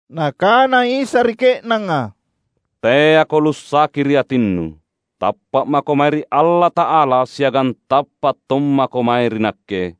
Nakana Isa ri ke’nanga, "Teako lussaki ri atinnu. Tappa’ mako mae ri Allata’ala, siagang tappa’ tommako mae ri Nakke.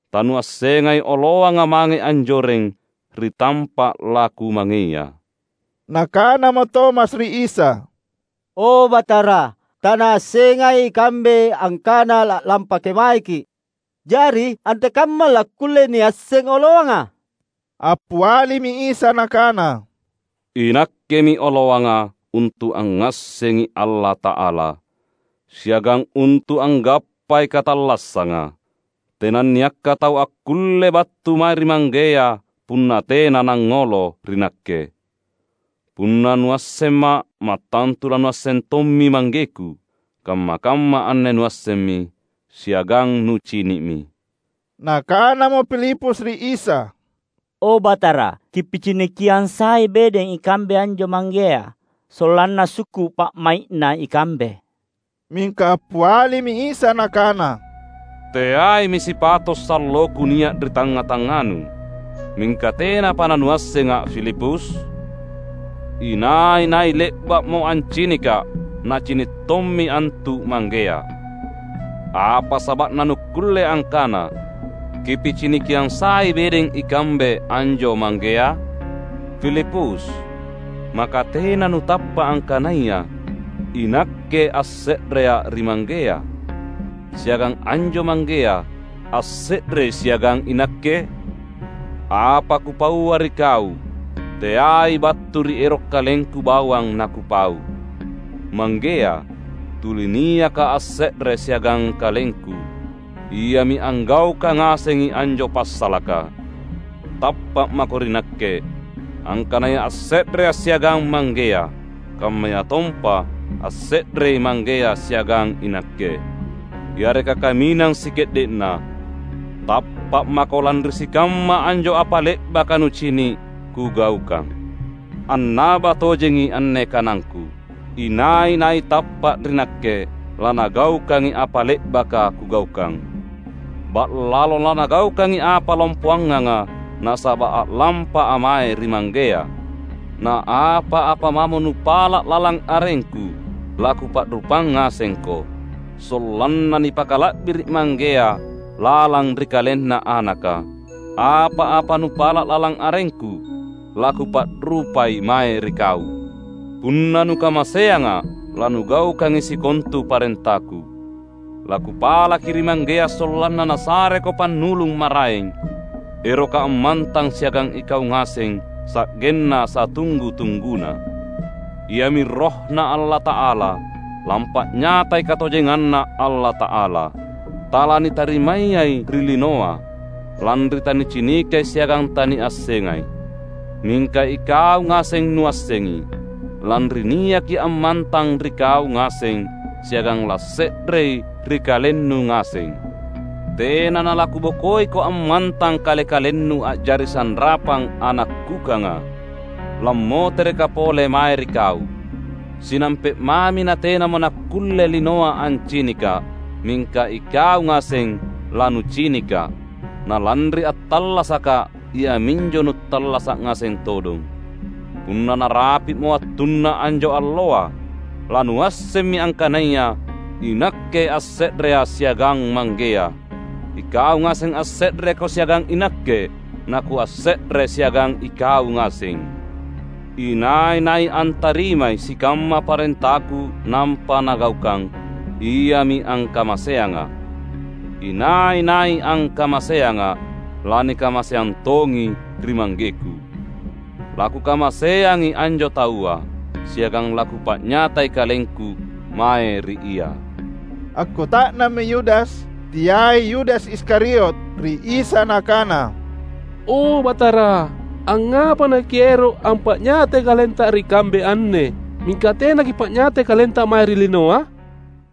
Tanuassengai oloanga mange anjoreng ri tampa’ laKumangeia." Nakanamo Tomas ri Isa, "O Batara, tanaassengai ikambe angkana la’lampa kemaeKi’, jari antekamma lakkulle niasseng oloanga?" Appialimi Isa Nakana, "INakkemi oloanga untu’ angngassengi Allata’ala, siagang untu’ anggappai katallassanga. Tenanniakka tau akkulle battu mae ri Manggea punna tena nangngolo ri Nakke. Punna nuassemMa’, mattantu lanuasseng tommi ManggeKu. Kamma-kamma anne nuassemmi, siagang nucini’mi." Nakanamo Filipus ri Isa, "O Batara, Kipicinikiang sai bedeng ikambe anjo Manggea, sollanna sukku’ pa’mai’na ikambe." Mingka appialimi Isa Nakana, "Teaimi sipato’ salloKu nia’ ri tangnga-tangnganu, mingka tenapa nanuassengA’ Filipus? Inai-nai le’ba’mo ancinikKa’, nacini’ tommi antu Manggea. Apa saba’na nukkulle angkana, ‘Kipicinikiang sai bedeng ikambe anjo Manggea?’ Filipus! Maka tena nutappa’ angkanaya iNakke asse’reA’ ri Manggea, siagang anjo Manggea asse’rei siagang iNakke? Apa Kupaua ri kau teai battu ri ero’ KalengKu bawang naKupau. Manggea, tuli niaka asse’re siagang KalengKu, Iami anggaukang ngasengi anjo passalaka. Tappa’ mako ri Nakke, angkanaya asse’reA’ siagang Manggea, kammayatompa asse’rei Manggea siagang iNakke. Yareka kaminang sike’de’na, tappa’ mako lanri sikamma anjo apa le’baka nucini’ Kugaukang. Annaba tojengi anne kanangKu: Inai-nai tappa’ ri Nakke, lanagaukangi apa le’baka Kugaukang, — ba’lalo lanagaukangi apa lompoanganga — nasaba’ a’lampA’ mae ri Manggea. Na apa-apa mamo nupala’ lalang arengKu, laKupa’rupang ngasengko, sollanna nipakala’biri’ Manggea lalang ri KalenNa Anaka. Apa-apa nupala’ lalang arengKu, laKupa’rupai mae ri kau." "Punna nukamaseangA’, lanugaukangi sikontu parentaKu. LaKupalaki ri Manggea, sollanna Nasareko Pannulung maraeng, eroka ammantang siagang ikau ngaseng sa’genna satunggu-tungguna. Iami RohNa Allata’ala, lampa’nyatayai katojenganNa Allata’ala. Talanitarimayai ri linoa, lanri tanicinikai siagang taniassengai. Mingka ikau ngaseng nuassengi, lanri niaki ammantang ri kau ngaseng, siagang lasse’rei ri kalennu ngaseng. Tena nalaKubokoiko ammantang kale-kalennu, a’jari sanrapang ana’ kukanga. LammoterekKa’ pole mae ri kau. Sinampe’ mami natenamo nakkulle linoa ancinikKa’. Mingka ikau ngaseng lanucinikKa’. Na lanri attallasakKa’, iaminjo nuttallasa’ ngaseng todong. Punna narapi’mo wattunna anjo alloa, lanuassemmi angkanaya iNakke asse’reA’ siagang Manggea, ikau ngaseng asse’reko siagang iNakke, na Kuasse’re siagang ikau ngaseng. Inai-nai antarimai sikamma parentaKu nampa nagaukang, iami angkamaseangA’. Inai-nai angkamaseangA’, lanikamaseang tongi ri ManggeKu. LaKukamaseangi anjo taua, siagang laKupa’nyatai KalengKu mae ri ia." Akkuta’nammi Yudas (teai Yudas Iskariot) ri Isa nakana, "O Batara, angngapa naKiero’ ampa’nyatai KalenTa ri kambe anne, mingka tena Kipa’nyatai KalenTa mae ri linoa?"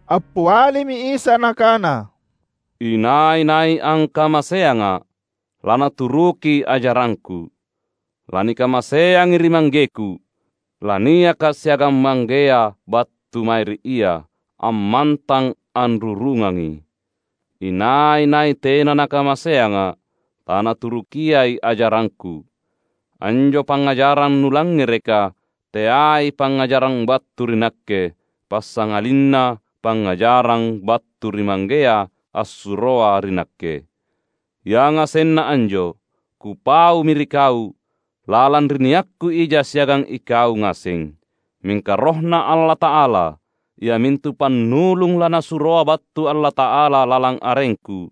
Appialimi Isa Nakana, "Inai-nai angkamaseangA’, lanaturuki ajarangKu. Lanikamaseangi ri ManggeKu. LaniakKa’ siagang Manggea battu mae ri ia, ammantang anrurungangi. Inai-nai tena nakamaseangA’, tanaturukiai ajarangKu. Anjo pangngajarang nulangngereka, teai pangngajarang battu ri Nakke, passangalinna pangngajarang battu ri Manggea, assuroa ri Nakke. Yangasenna anjo, Kupaumi ri kau, lalang ri niakKu ija siagang ikau ngaseng. Mingka RohNa Allata’ala, iamintu Pannulung laNasuroa battu Allata’ala lalang arengKu,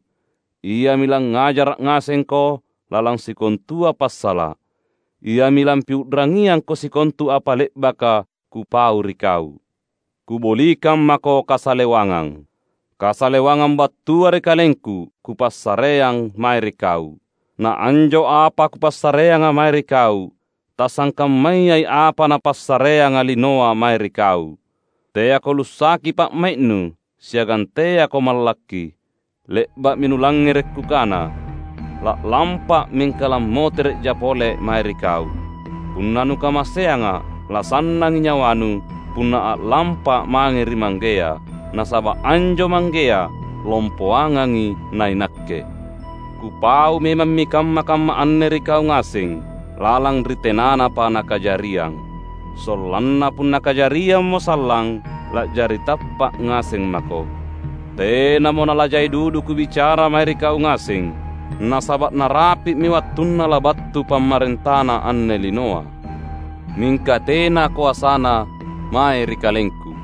Iami langngajara’ ngasengko lalang sikontua passala’. Iami lampiu’rangiangko sikontu apa le’baka Kupau ri kau. Kubolikang mako kasalewangang. Kasalewangang battua ri KalengKu Kupassareang mae ri kau. Na anjo apa Kupassareanga mae ri kau, tasangkammayai apa napassareanga linoa mae ri kau. Teako lussaki pa’mai’nu, siagang teako mallakki. Le’ba’mi nulangngere’ Kukana, ‘La’lampA’, mingka lammotere’jA’ pole mae ri kau’. Punna nukamaseangA’, lasannangi nyawanu punna a’lampA’ mange ri Manggea. Nasaba’ anjo Manggea, lompoangangi naiNakke. Kupau memammi kamma-kamma anne ri kau ngaseng, lalang ri tenanapa nakajariang. Sollanna punna kajariammo sallang, la’jari tappa’ ngaseng mako. Tenamo nalajai dudu Kubicara mae ri kau ngaseng, nasaba’ narapi’mi wattunna labattu pamarentana anne linoa. Mingka tena koasana mae ri KalengKu.